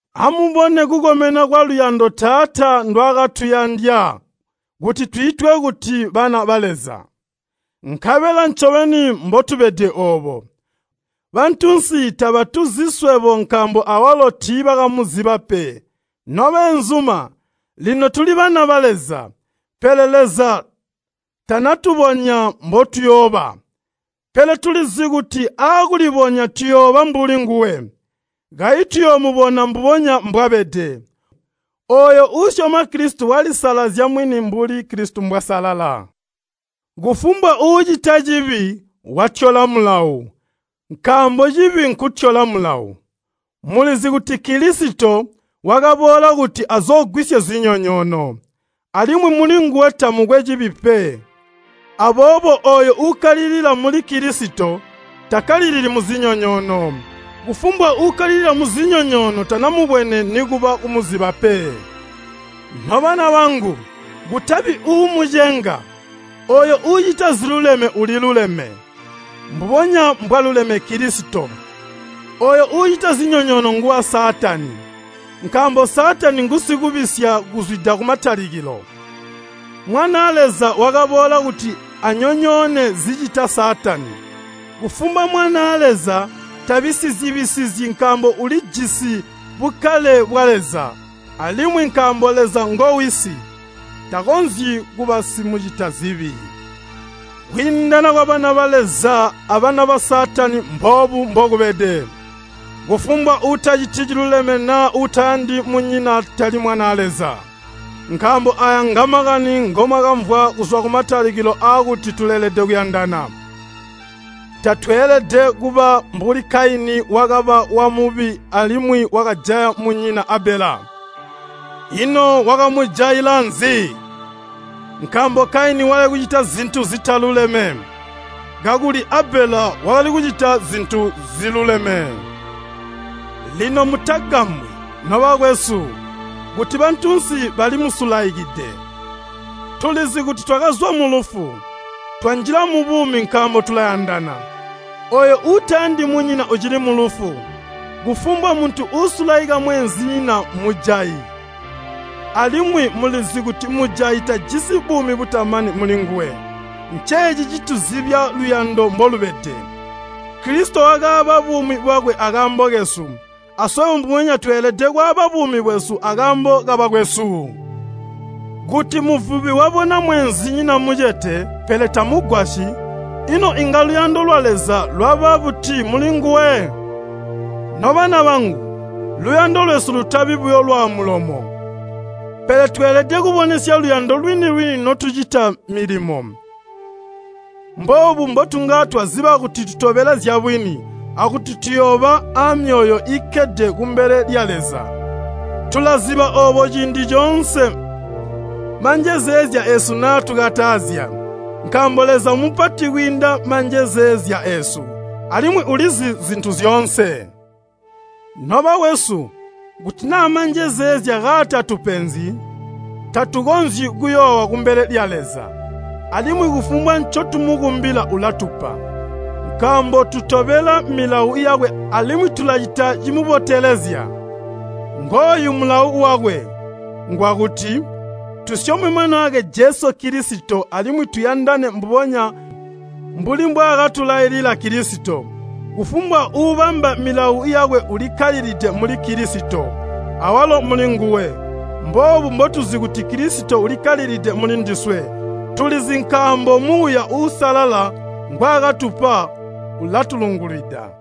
Amubone kukomena kwaluyando Taata ndwaakatuyandya kuti twiitwe kuti bana ba Leza. Nkabela ncobeni mbotubede oobo. Bantunsi tabatuzi swebo nkaambo awalo tiibakamuziba pe. Nobeenzuma, lino tuli bana ba Leza, Pele Leza tanatubonya mbotuyooba. Pele tulizi kuti aakulibonya tuyooba mbuli nguwe. Kayi tuyoomubona mbubonya mbwabede. Ooyo uusyoma Kilisito walisalazya mwini mbuli Kilisito mbwasalala. Kufumbwa uucita cibi, watyola mulawo, nkaambo cibi nkutyola mulawo. Mulizi kuti Kilisito wakaboola kuti azoogwisye zinyonyoono, alimwi mulinguwe tamukwe cibi pe. Aboobo ooyo uukkalilila muli Kilisito takkalilili muzinyonyoono. Kufumbwa uukkalilila muzinyonyoono tanamubwene nikuba kumuziba pe. Nobana bangu, kutabi uumucenga. Ooyo uucita ziluleme uliluleme, mbubonya mbwaluleme Kilisito. Ooyo uucita zinyonyoono nguwa Saatani, nkaambo Saatani ngusikubisya kuzwida kumatalikilo. Mwanaa Leza wakaboola kuti anyonyoone zicita Saatani. Kufumbwa mwanaa Leza tabisizyi-bisizyi nkaambo ulijisi bukkale bwa Leza, alimwi nkaambo Leza ngo Wisi, takonzyi kuba simucitazibi. Kwiindana kwabana ba Leza abana ba Saatani mboobu mbokubede, kufumbwa uutaciti ciluleme naa uutayandi munyina tali mwanaa Leza. Nkaambo aaya ngamakani ngomwakamvwa kuzwa kumatalikilo aakuti tuleelede kuyandana. Tatweelede kuba mbuli Kaini wakaba wa Mubi alimwi wakajaya munyina Abela. Ino wakamujaila nzi? Nkaambo Kaini wakali kucita zintu zitaluleme, kakuli Abela wakali kucita zintu ziluleme. Lino mutagambwi, nobakwesu, kuti bantunsi bali musulaikide. Tulizi kuti twakazwa mulufu, twanjila mubuumi nkaambo tulayandana. Ooyo uutayandi munyina ucili mulufu. Kufumbwa muntu uusulaika mweenzinyina mmujayi, alimwi mulizi kuti mujayi tajisi buumi butamani mulinguwe. Nceeci ncituzibya luyando mbolubede, Kilisito wakaaba buumi bwakwe akaambo kesu. Aswebo mbubonya tweelede kwaaba buumi bwesu akaambo kabakwesu! Kuti muvubi wabona mweenzinyina mucete, pele tamugwasyi, ino inga luyando lwa Leza lwaba buti mulinguwe? Nobana bangu, luyando lwesu lutabi buyo lwaamulomo, pele tweelede kubonesya luyando lwini-lwini notucita milimo. Mboobu mbotunga twaziba kuti tutobela zyabwini akuti tuyooba amyoyo iikkede kumbele lya Leza. Tulaziba oobo ciindi coonse manjezeezya eesu naatukatazya, nkaambo Leza mmupati kwiinda manjezeezya eesu, alimwi ulizi zintu zyoonse. Nobakwesu, kuti naa manjezeezya kaatatupenzyi, tatukonzyi kuyoowa kumbele lya Leza. Alimwi kufumbwa ncotumukumbila ulatupa, nkaambo tutobela milawo yakwe alimwi tulacita cimubotelezya. Ngooyu mulawo wakwe, ngwakuti, tusyome Mwanaakwe Jesu Kilisito alimwi tuyandane mbubonya mbuli mbwaakatulailila Kilisito. Kufumbwa uubamba milawo yakwe ulikkalilide muli Kilisito, awalo mulinguwe. Mboobu mbotuzi kuti Kilisito ulikkalilide muli ndiswe, tulizi nkaambo Muuya Uusalala ngwaakatupa ulatulungwilida.